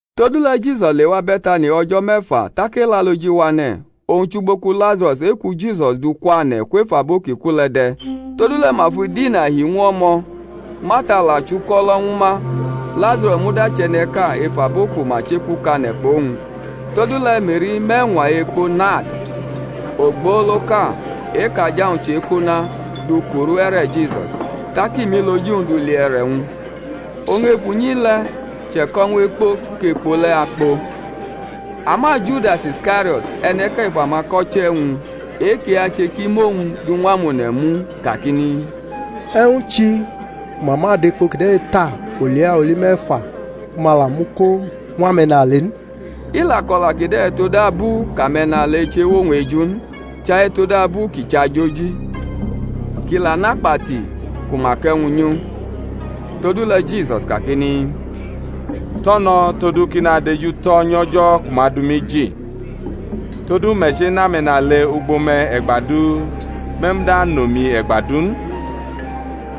Todule̩ Jisus lewa Be̩tani o̩jo̩ me̩fa tak Elaloji wane̩, owñ chʼugbo ku Lazaro̩s e-ku Jisus dʼu kwane̩ kwef abo ki ku le̩ de̩. Todule̩ ma fʼidina hi ñw u o̩mo̩, Marta la chʼuko̩lo̩ ñwu ma, Lazaro̩s muda chʼe̩ne̩ʼka ef abo ku ma chekukane̩ kpʼowñ. Todule̩ Me̩ri mʼe̩ñwa ekpo nard ogboloʼka, e-kʼaja-wñ chʼe̩kpuna, du kuru e̩re̩ Jisus, tak i mʼiloji-wñ du li e̩re̩-wñ; oñ ef unyi le̩ che̩ko̩ ñw ekpo kʼekpo le̩ akpo. Ama Judas Iskario̩t, e̩ne̩ʼka ef amako̩che̩-wñ e-kʼi ache kʼi mʼowñ du ñw amone̩ mu, kakini, E̩wñ chi ku ma ma dʼekpo kide̩ ta olia oli me̩fa ku ma la mʼu ko ñw ame̩nale n? I la ko̩la kide̩ todabu kʼame̩nale chewʼowñ eju n, chai todabu kʼi chʼajoji, kʼi la nʼakpati ku ma kʼe̩wñ nyʼu. Todule̩ Jisus kakini, Tʼo̩ no̩, todu kʼi nadejutʼo̩ nyʼo̩jo̩ ku ma dʼumi ji. Todu me̩ chenʼame̩nale ugbo me̩ e̩gba du, me̩ muda anʼomi e̩gba du n.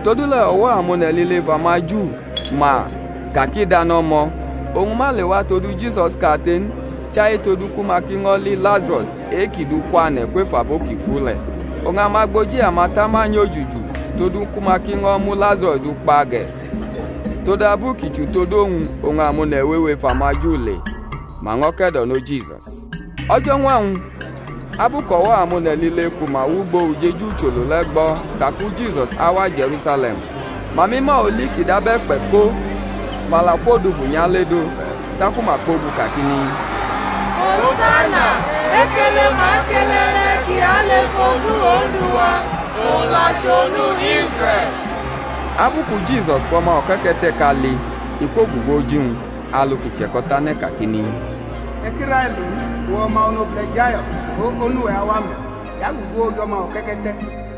Todule̩ o̩wo̩ amone̩ lile ef amaJu ma ka kʼi dʼano̩mo̩, oñ ma lewa todu Jisus kate n, chai todu ku ma ki ño̩ li Lazaro̩s e-kʼi dukwane̩ kwef abo ki ku le̩. Oñ amagboji amatama nyojuju todu ku ma ki ño̩ mu Lazaro̩s du kpa ge̩; todabu ki chʼutod uwñ oñ amone̩ wewe ef amaJu le̩, ma ño̩ ke̩do̩no Jisus. O̩jo̩ñwa-wñ abu kʼo̩wo̩ amone̩ lile ku ma wʼugbo-ujeju ucholo le̩ gbo ka ku Jisus awa Je̩rusale̩m, ma mʼima oli ki dab e̩kpe̩ ko, ma la kwodufu nyʼaledʼo, taku ma kpogu kakini, Hosana! Ekele ma kele e̩ne̩ ki alʼef odu Ondu wa, owñ la chʼOnu Israe̩l. Abu ku Jisus fʼo̩ma o̩ke̩ke̩te̩ʼka li, i kwogugu oji-wñ, alu ki che̩ko̩tane̩ kakini, E̩ ki railo n, uwe̩ o̩ma onobule̩ Zayo̩n; go onu-we̩ awa me̩, i gugu oj o̩ma o̩ke̩ke̩te̩.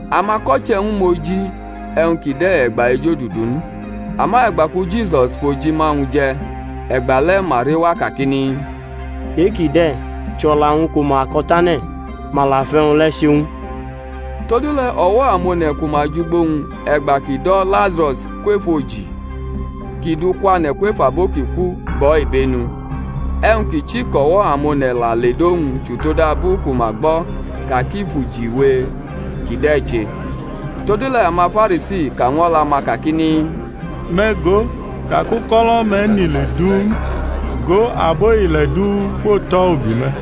Amako̩che̩-wñ mʼoji e̩wñ kide̩ e̩gba ejodudu n, ama e̩gba ku Jisus fʼojima-wñ je̩, e̩gbale̩ ma rewa kakini, E-kide̩ chʼo̩la-wñ ku ma ko̩tane̩; ma la fʼe̩wñ le̩ che ñw u. Todule̩ o̩wo̩ amone̩ ku ma jʼugbo-wñ e̩gba kʼi do̩ Lazaro̩s kwef oji kʼi dʼu kwane̩ kwef abo ki ku, gbʼo̩ ibenu. E̩wñ ki chi kʼo̩wo̩ amone̩ la ledʼowñ chʼutodabu ku ma gbo̩ ka kʼi fʼujiwe kide̩ che. Todule̩ amaFarisi ka ñw o̩la-ma kakini, Me̩ go, ka kʼuko̩lo̩-me̩ nʼile du n; go, abo ile̩ du kwotʼo̩ ubi me̩.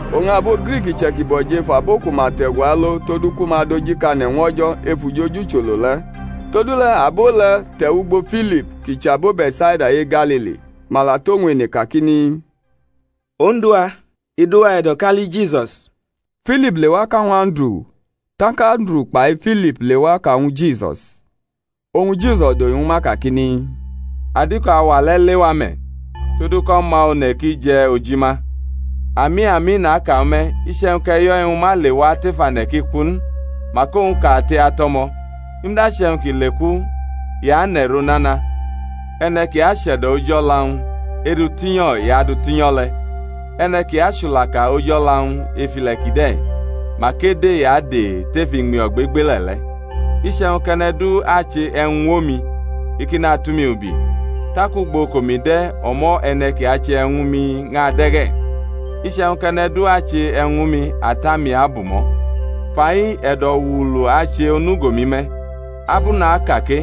Oñ abo Griki iche̩kibo̩ jʼef abo ku ma te̩gu alo todu ku ma dojikane̩ ñw O̩jo̩ ef ujeju ucholo le̩; todule̩ abo le̩ te̩wʼugbo Filip kʼi chʼabo Be̩tsaida e-Galili; ma la tʼowñ ene kakini, Odu-wa, i dʼuwa e̩do̩ kʼa li Jisus. Filip lewa ka ñwu Anduru; tak Anduru kpai Filip lewa ka ñwu Jisus. Oñ Jisus dohi ñwu ma kakini, Adiko auwa le̩ lewa me̩, todu kʼO̩ma One̩ ki je̩ ojima. Ami, ami, naka ñwu me̩, iche̩wñ kʼe̩yo̩ e̩wñ ma lewa tef ane̩ kʼi ku n, mak owñ kate atʼo̩mo̩; i muda che̩wñ kʼi leku i anʼe̩ro nana. E̩ne̩ ki ache̩do̩ oji o̩la-wñ, edʼu tinyo̩ i adʼu tinyo̩ le̩; e̩ne̩ ki achulaka oji o̩la-wñ ef ile̩ kide̩, mak ede i ade̩ tef iñmi ogbegbele̩ le̩. Iche̩wñ kʼe̩ne̩ du ache e̩wñ ñw omi, i ki natʼumi ubi; tak ugbo kʼomi de̩, o̩mo̩ e̩ne̩ ki ache e̩wñ ñwu mi ñʼade̩ ge̩; iche̩wñ kʼe̩ne̩ du ache e̩wñ ñwu mi, Ata-mi abumʼo̩. Fai e̩do̩wuulu ache onugo-mi me̩; ab u naka ke?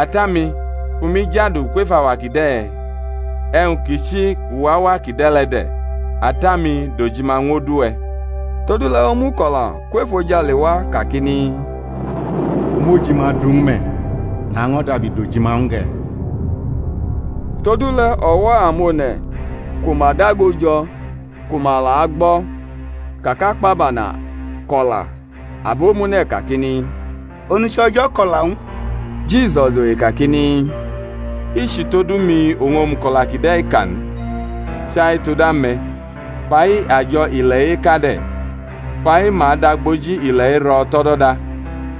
Ata-mi, fʼumi jadu kwef auwa kide̩? E̩wñ ki chi kʼu wʼauwa kide̩ le̩ de̩. Ata-mi, dʼojima ñw odu-we̩. Todule̩ omuko̩la kwʼefojale wa kakini, U mʼojima du ñw u me̩, naño̩ dabi dʼojima ñw u ge̩. Todule̩ o̩wo̩ amone̩ ku ma dago jo̩ ku ma la agbo̩, ka kʼakpabana ko̩la; abomune̩ kakini, Onuche̩ O̩jo̩ ko̩la ñw u. Jisus dohi kakini, I chʼutodu mi oñ omuko̩la kide̩ ka n, chai tod ame̩. Fa-i ajo̩ ile̩-i eka de̩; fa-i ma adʼagboji ile̩-i ro̩ tʼo̩do̩da.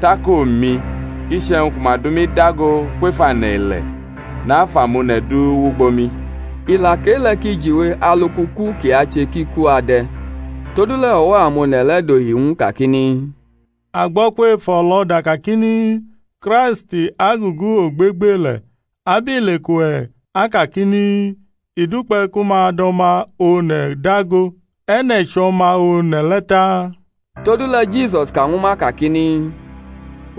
Tak omi, iche̩wñ ku ma dʼumi dago kwef ane̩-ile̩, nafʼamone̩ du wʼugbo mi. I la kʼe-le̩ kʼi jiwe alu kʼuku kʼi ache kʼi ku ade̩. Todule̩ o̩wo̩ amone̩ le̩ dohi ñw u kakini, A gbo̩ kwef o̩lo̩da kakini, Kraist agugu ogbegbele̩, abile kʼuwe̩ akakini, I dukpe̩ ku ma dʼO̩ma One̩ dago? E̩ne̩ chʼO̩ma One̩ le̩ taa? Todule̩ Jisus ka ñwu ma kakini,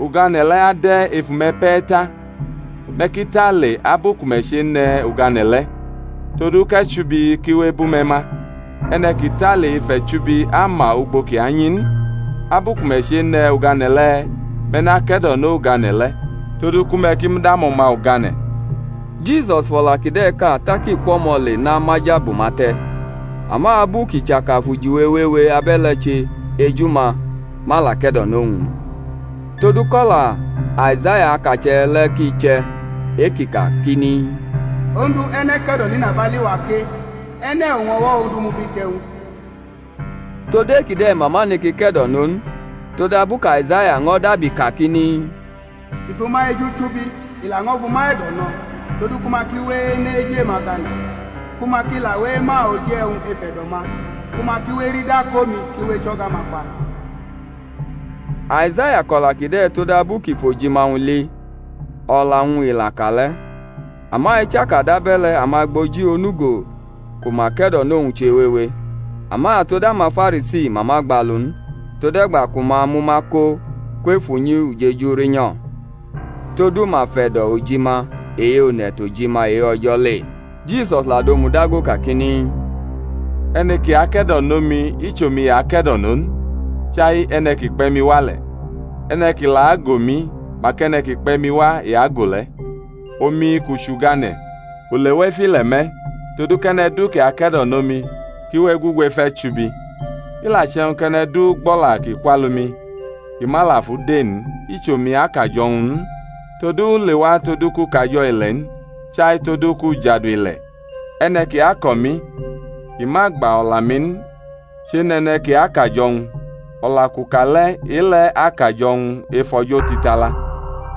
Ugane̩ le̩ ade̩ ef ume̩ pe̩ ta. Me̩ ki tale abu ku me̩ chene̩ ugane̩ le̩, todu kʼe̩chubi ki we ebʼume̩ ma; e̩ne̩ ki tale ef e̩chubi ama ugbo kʼi anyi n. Abu ku me̩ chene̩ ugane̩ le̩ me̩ nake̩do̩no ugane̩ le̩ todu ku me̩ ki mud amo̩ma ugane̩. Abo Juda ko̩ eke̩do̩nʼo Jisus fʼo̩la kide̩ ka tak i kwʼo̩mo̩ le namaja bʼuma te̩. Ama abu kʼi chaka fʼujiwe wewe abe̩le̩ che eju-ma, ma la ke̩do̩nʼowñ n; todu kʼo̩la Aizaya akache̩ le̩ ki che̩, e-ki kakini, Ondu, e̩ne̩ ke̩do̩nʼinabali-wa ke? E̩ne̩ oñ o̩wo̩ Ondu mubite̩ ñw u? Tod e-kide̩ ma ma neke ke̩do̩no n, todabu kʼAizaya ño̩ dabi kakini, I fʼuma eju chubi, i laño̩ fʼuma e̩do̩ no̩; todu ku ma ki we ene̩ eju-ma gane̩, ku ma ki la we ema oji e̩wñ ef e̩do̩-ma, ku ma ki we erida kʼomi ki we echo̩ga-ma kpa. Aizaya ko̩la kide̩ todabu kʼi fʼoji-ma-wñ li, o̩la-wñ i la ka le̩. Ama ichaka dabe̩le̩ amagboji onugo ku ma ke̩do̩nʼowñ chewewe; ama tod amaFarisi ma ma gbalu n, tode̩gba ku ma amʼuma ko kwef unyi ujeju rinyo̩; todu ma fe̩do̩ ojima e-one̩ tʼojima e-O̩jo̩ le. Jisus la domudago kakini, E̩ne̩ ki ake̩do̩nʼomi, i chʼomi i ake̩do̩no n, chai e̩ne̩ ki kpe̩ mi wa le̩. E̩ne̩ ki la ago mi, mak e̩ne̩ ki kpe̩ mi wa i ago le̩. Omi kʼu chʼugane̩, u lewa ef ile̩ me̩, todu kʼe̩ne̩ du ki ake̩do̩nʼomi ki we egugu ef e̩chubi. I la che̩wñ kʼe̩ne̩ du gbʼo̩la ki kwʼalu-mi, kʼi ma la fʼu de n, i chʼomi akʼajo̩-wñ n; todu u lewa todu kʼu kajo̩ ile̩ n, chai todu kʼu jadu ile̩. E̩ne̩ ki ako̩ mi, kʼi ma gba o̩la-mi n, chenʼe̩ne̩ ki akʼajo̩-wñ; o̩la kʼu ka le̩ e-le̩ akʼajo̩-wñ ef o̩jo̩ otitala.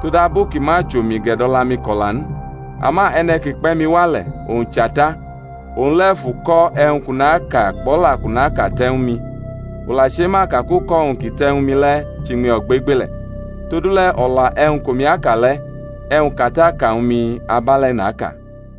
Todabu ki ma chʼomi gʼe̩do̩la-mi ko̩la n; ama e̩ne̩ ki kpe̩ mi wa le̩, owñ chʼAta, owñ le̩ fʼuko̩ e̩wñ kʼu naka kpʼo̩la kʼu naka te̩ ñwu mi. U la chema ka kʼuko̩-wñ kʼi te̩ ñwu mi le̩ chʼiñmi ogbegbele̩; todule̩ o̩la e̩wñ kʼomi aka le̩, e̩wñ kʼAta ka ñwu mi, abe̩le̩ naka.